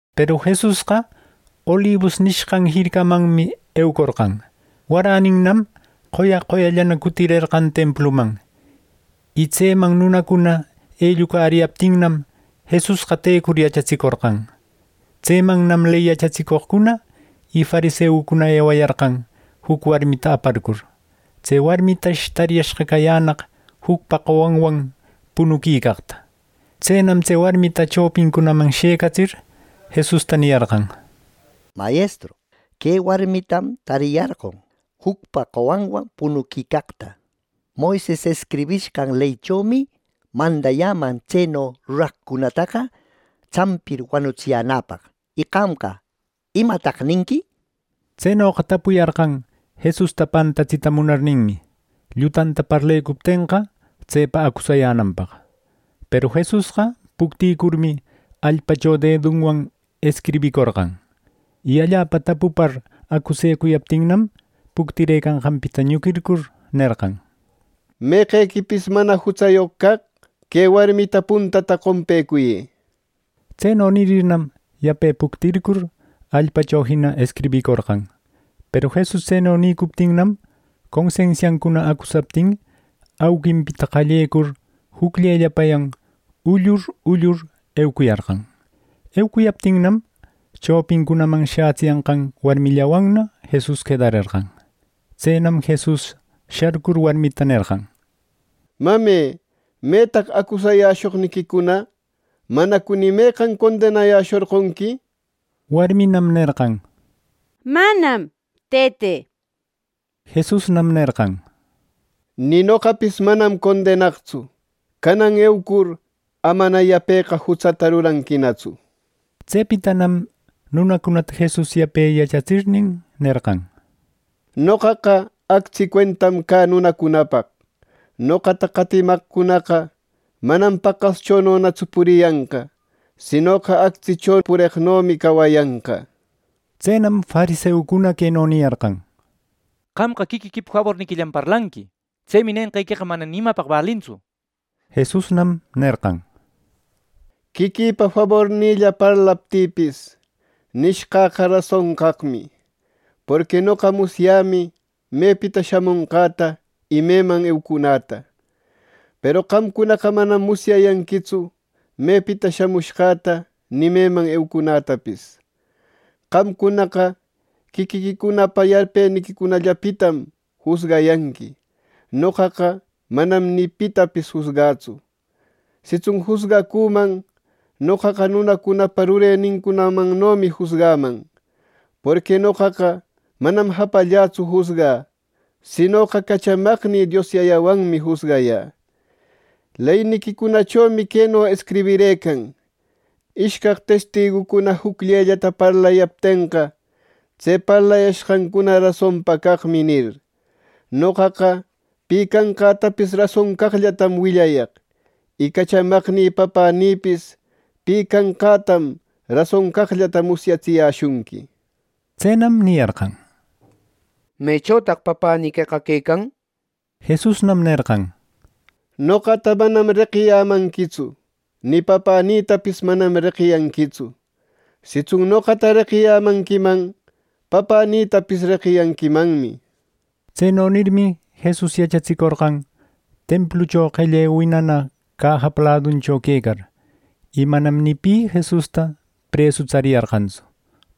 Peru Jesusqa Olibus nishqan jircamanmi eucorqan. Waraninam qoya qoyallana cutirerqan templuman. Y tseman nunacuna ellucariyaptinnam, Jesusqa tecur yachatsicorqan. Tsemannam ley yachatsicoqcuna y fariseucuna ewayarqan, juc warmita aparcur. Tse warmitash tariyashqa cayänaq jucpa qowanwan punuquicaqta. Tsenam tse warmita chopincunaman shëcatsir, Jesusta niyarqan: —Mayestru, que warmitam tariyarqon jucpa qowanwan punuquicaqta. Moises escribishqan leychomi mandayäman tseno ruraqcunataqa tsampir wanutsiyänäpaq. Y qamqa ¿imataq ninqui? —nir. Tsenoqa tapuyarqan Jesusta pantatsita munarninmi, llutanta parlecuptenqa, tsepa acusayänanpaq. Peru Jesusqa puctïcurmi allpacho dedunwan escribicorqan. Y allapa tapupar acusecuyaptinnam, puctirëcanqanpita ñuquircur nerqan: —Meqequipis mana jutsayoq caq, que warmita puntata qompecuyë —nir. Tseno nirirnam, yape puctircur, allpacho jina escribicorqan. Peru Jesus tseno nïcuptinnam, consensiancuna acusaptin, auquinpita qallecur jucllellapayan ullur ullur eucuyarqan. Eucuyaptinnam, chopincunaman shätsiyanqan warmillawanna Jesus quedarerqan. Tsenam Jesus sharcur warmita nerqan: —Mame, ¿metaq acusayäshoqniquicuna! ¿Manacu ni meqan condenayäshorqonqui! —nir. Warminam nerqan: —Manam, Tëte —nir. Jesusnam nerqan: —Ni noqapis manam condenaqtsu. Canan eucur, amana yapeqa jutsata ruranquinatsu —nir.˼ Tsepitanam nunacunata Jesus yape yachatsirnin, nerqan: —Noqaqa actsi cuentam cä nunacunapaq. Noqata qatimaqcunaqa manam paqaschononatsu puriyanqa, sinoqa, actsicho pureqnomi cawayanqa —nir. Tsenam fariseucuna queno niyarqan: —Qamqa quiquiquipa faborniquillam parlanqui. Tsemi nenqequeqa mana ni imapaq balintsu. Jesusnam nerqan: —Quiquïpa fabornïlla parlaptïpis, nishqäqa rason caqmi. Porqui noqa musyämi mepita shamonqäta y meman eucunäta. Peru qamcunaqa manam musyayanquitsu mepita shamushqäta ni meman eucunätapis. Qamcunaqa quiquiquicunapa yarpeniquicunallapitam jusgayanqui. Noqaqa manam ni pitapis jusgätsu. Sitsun jusgacüman, noqaqa nunacunapa rureninmannomi jusgaman, porqui noqaqa manam japallätsu jusgä, sinoqa cachamaqnï Dios Yayawanmi jusgayä. Leyniquicunachomi queno escribirëcan: “Ishcaq testigucuna jucllellata parlayaptenqa, tse parlayashqancuna rasonpa caqmi” nir. Noqaqa pi canqätapis rason caqllatam willayaq; y cachamaqnï Papänïpis pi canqätam rason caqllata musyatsiyäshunqui —nir. Tsenam niyarqan: —¿Mechotaq papäniqueqa quecan? —nir. Jesusnam nerqan: —Noqata manam reqiyämanquitsu, ni Papänïtapis manam reqiyanquitsu. Sitsun noqata reqiyämanquiman, Papänïtapis reqiyanquimanmi —nir. Tseno nirmi, Jesus yachatsicorqan templucho, qelle winana cajapa laduncho quecar, y manam ni pi Jesusta presu tsariyarqantsu,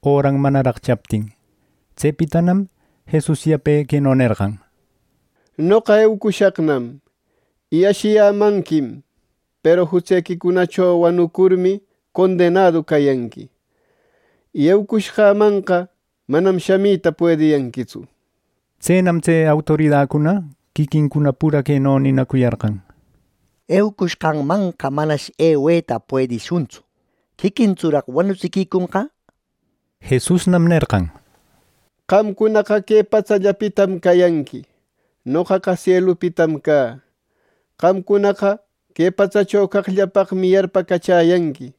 öran manaraq chaptin. Tsepitanam Jesus yape queno nerqan: —Noqa eucushaqnam, y ashiyämanquim, peru jutsequicunacho wanucurmi condenadu cayanqui. Y eucushqämanqa manam shamita puediyanquitsu. Tsenam tse autoridacuna quiquincuna pura queno ninacuyarqan: —Eucushqanmanqa manash eweta puedishuntsu. ¿Quiquintsuraq wanutsiquiconqa! —nir. Jesusnam nerqan: —Qamcuna que patsallapitam cayanqui. Noqaqa sielupitam cä. Qamcunaqa que patsacho caqllapaqmi yarpacachäyanqui,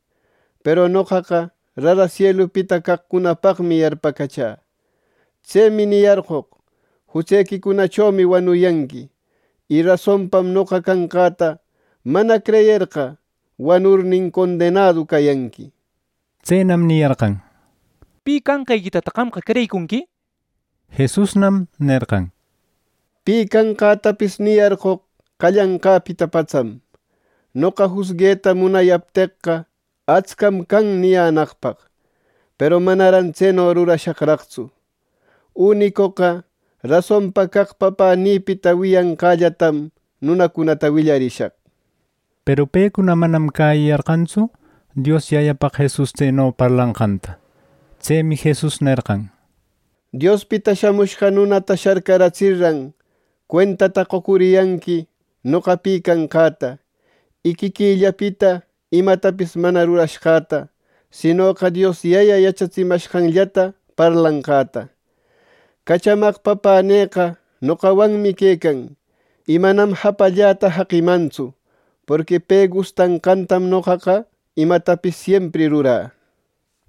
peru noqaqa rara sielupita caqcunapaqmi yarpacachä. Tsemi niyarqoq, ‘Jutsequicunachomi wanuyanqui.’ Y rasonpam, Noqa Canqäta mana creyerqa, wanurnin condenadu cayanqui —nir. Tsenam niyarqan: —¿Pi canqequitataq qamqa creyicunqui? —nir. Jesusnam nerqan: —Pi canqätapis niyarqoq qallanqäpita patsam. Noqa jusgueta munayapteqqa atscam can niyänaqpaq. Peru manaran tseno rurashaqraqtsu. Unicoqa rasonpa caq Papänïpita wiyanqällatam nunacunata willarishaq —nir. Peru pecuna manam cäyiyarqantsu Dios Yayapaq Jesus tseno parlanqanta. Tsemi Jesus nerqan: —Diospita Shamushqa Nunata sharcaratsirran, cuentata qocuriyanqui noqa pi canqäta, y quiquïllapita imatapis mana rurashqäta, sinoqa Dios Yaya yachatsimashqanllata parlashqäta. Cachamaq Papänïqa noqawanmi quecan, y manam japalläta jaqimantsu, porqui pe gustanqantam noqaqa imatapis siempri rurä —nir.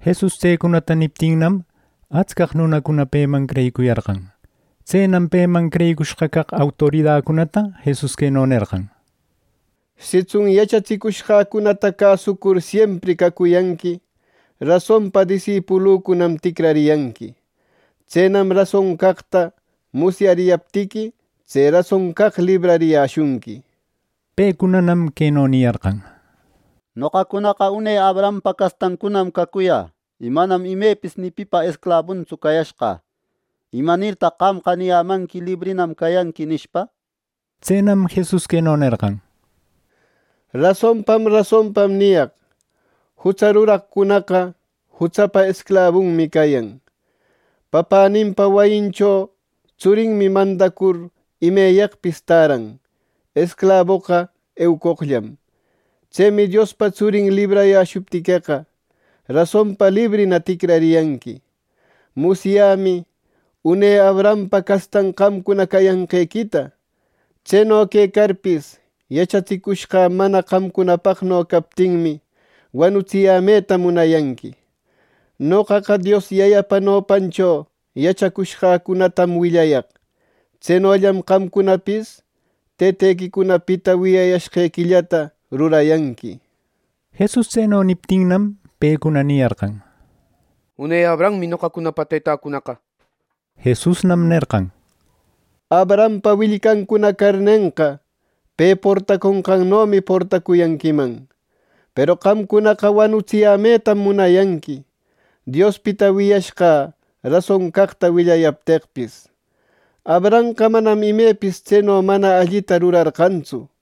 Jesus tsecunata niptinnam, atscaq nunacuna peman creyicuyarqan. Tsenam peman creyicushqa caq autoridacunata Jesus queno nerqan: —Sitsun yachatsicushqäcunata cäsucur siempri cacuyanqui, rasonpa disipulücunam ticrariyanqui. Tsenam rason caqta musyariyaptiqui, tse rason caq librariyäshunqui —nir. Pecunanam queno niyarqan: —Noqacunaqa une Abrahampa castancunam cacuyä, y manam imepis ni pipa esclabuntsu cayashqä. ¿Imanirtaq qamqa niyämanqui ‘Librinam cayanqui?’ —nishpa. Tsenam Jesus queno nerqan: —Rasonpam rasonpam niyaq: Jutsa ruraqcunaqa jutsapa esclabunmi cayan. Papäninpa wayinchoqa tsurinmi mandacur imeyaqpis täran, esclaboqa eucoqllam. Tsemi Diospa Tsurin librayäshuptiqueqa, rasonpa librina ticrariyanqui. Musyämi une Abrahampa castan qamcuna cayanqequita. Tseno quecarpis, yachatsicushqä mana qamcunapaqno captinmi, wanutsiyämeta munayanqui. Noqaqa Dios Yayapa nopancho yachacushqäcunatam willayaq. Tsenollam qamcunapis Tëtequicunapita wiyayashqequillata rurayanqui —nir. Jesus tseno niptinnam, pecuna niyarqan: —Une Abrahammi noqacunapa tetäcunaqa —nir. Jesusnam nerqan: —Abrahampa willcancuna carnenqa, pe portaconqannomi portacuyanquiman. Peru qamcunaqa wanutsiyämetam munayanqui, Diospita wiyashqä rason caqta willayapteqpis. Abrahamqa manam imepis tseno mana allita rurarqantsu.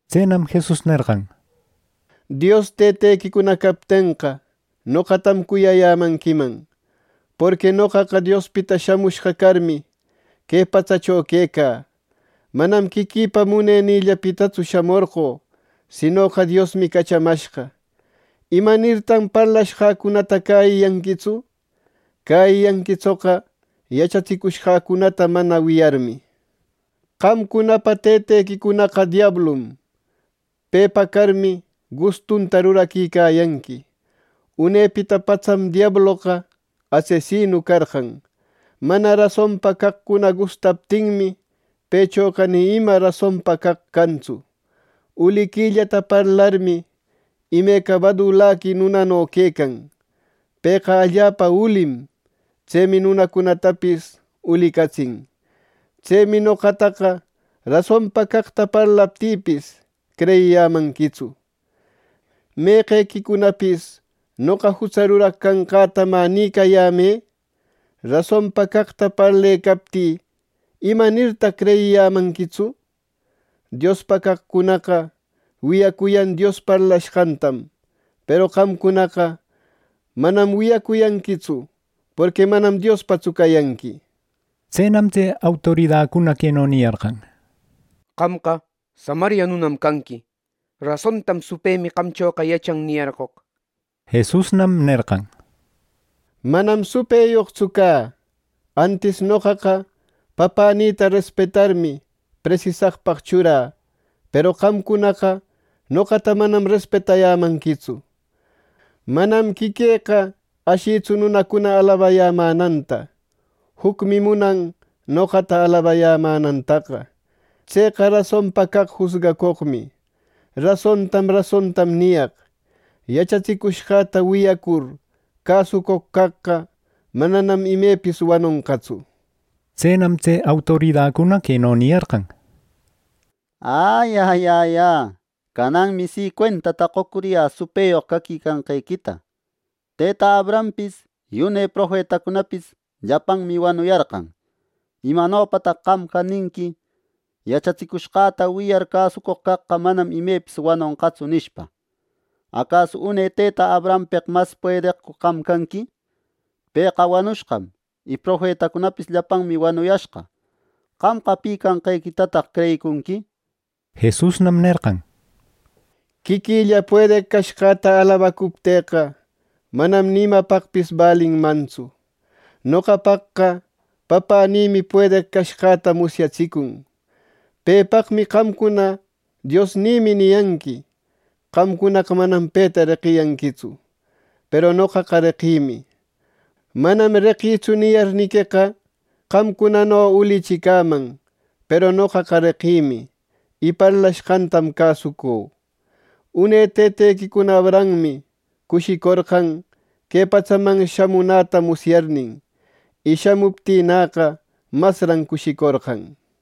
Tsenam Jesus nerqan: —Dios tëtequicuna captenqa, noqatam cuyayämanquiman; porqui noqaqa Diospita shamushqa carmi, que patsacho quecä. Manam quiquïpa munenïllapitatsu shamorqö, sinoqa Diosmi cachamashqa. ¿Imanirtan parlashqäcunata cäyiyanquitsu? Cäyiyanquitsoqa, yachatsicushqäta mana wiyarmi. Qamcunapa tëtequicunaqa diablum. Pepa carmi, gustunta ruraquicayanqui. Unepita patsam diabloqa asesinu carqan. Mana rasonpa caqcuna gustaptinmi, pëchoqa ni ima rasonpa caq cantsu. Uliquillata parlarmi, imeca badulaqui nunano quecan. Pëqa allapa ulim; tsemi nunacunatapis ulicatsin. Tsemi noqataqa rasonpa caqta parlaptïpis, creyiyämanquitsu. ¿Meqequicunapis noqa jutsa ruraq canqäta, mä nïcayämë? Rasonpa caqta parlecaptï, ¿Imanirtaq creyiyämanquitsu? Diospa caqcunaqa wiyacuyan Dios parlashqantam; peru qamcunaqa manam wiyacuyanquitsu, porqui manam Diospatsu cayanqui —nir. Tsenam tse autoridacuna queno niyarqan: —Qamqa samaria nunam canqui. Rasontam supëmi qamchoqa yachan niyarqoq —nir. Jesusnam nerqan: —Manam supëyoqtsu cä. Antis noqaqa Papänïta respetarmi, presisaqpaq churä; peru qamcunaqa noqata manam respetayämanquitsu. Manam quiquïqa ashïtsu nunacuna alabayämänanta. Jucmi munan noqata alabayämänantaqa. Tseqa rasonpa caq jusgacoqmi. Rasontam rasontam niyaq: Yachatsicushqäta wiyacur cäsucoq caqqa, mananam imepis wanonqatsu —nir. Tsenam tse autoridacuna queno niyarqan: —¡Ä ya, cananmi si cuentata qocuriyä supëyoq caquicanqequita! Tëta Abrahampis y une profetacunapis llapanmi wanuyarqan. ¿Imanopataq qamqa ninqui ‘Yachatsicushqäta wiyar cäsucoq caqqa, manam imepis wanonqatsu!’ nishpa. ¿Acasu une tëta Abrahampeq mas puedeqcu qam canqui! Pëqa wanushqam, y profetacunapis llapanmi wanuyashqa. ¿Qamqa pi canqequitataq creyicunqui! —nir. Jesusnam nerqan: —Quiquilla puedeq cashqäta alabacuptïqa, manam ni imapaqpis balinmantsu. Noqapaqqa Papänïmi puedeq cashqäta musyatsicun. Pepaqmi qamcuna ‘Diosnïmi’ niyanqui. Qamcunaqa manam peta reqiyanquitsu, peru noqaqa reqïmi. ‘Manam reqïtsu’ niyarniqueqa, qamcunano ulichi cäman; peru noqaqa reqïmi, y parlashqantam cäsucü. Une tëtequicuna Abrahammi cushicorqan, que patsaman shamunäta musyarnin. Y shamuptïnäqa, masran cushicorqan —nir.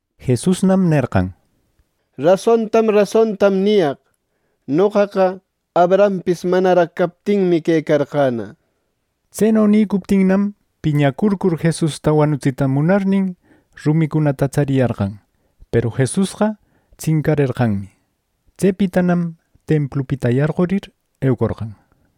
Jesusnam nerqan: —Rasontam rasontam niyaq: Noqaqa Abrahampis manaraq captinmi quecarqäna. Tseno nicuptinnam, piñacurcur Jesusta wanutsita munarnin, rumicunata tsariyarqan, peru Jesusqa tsincarerqanmi. Tsepitanam templupita yarqurir, eucorqan.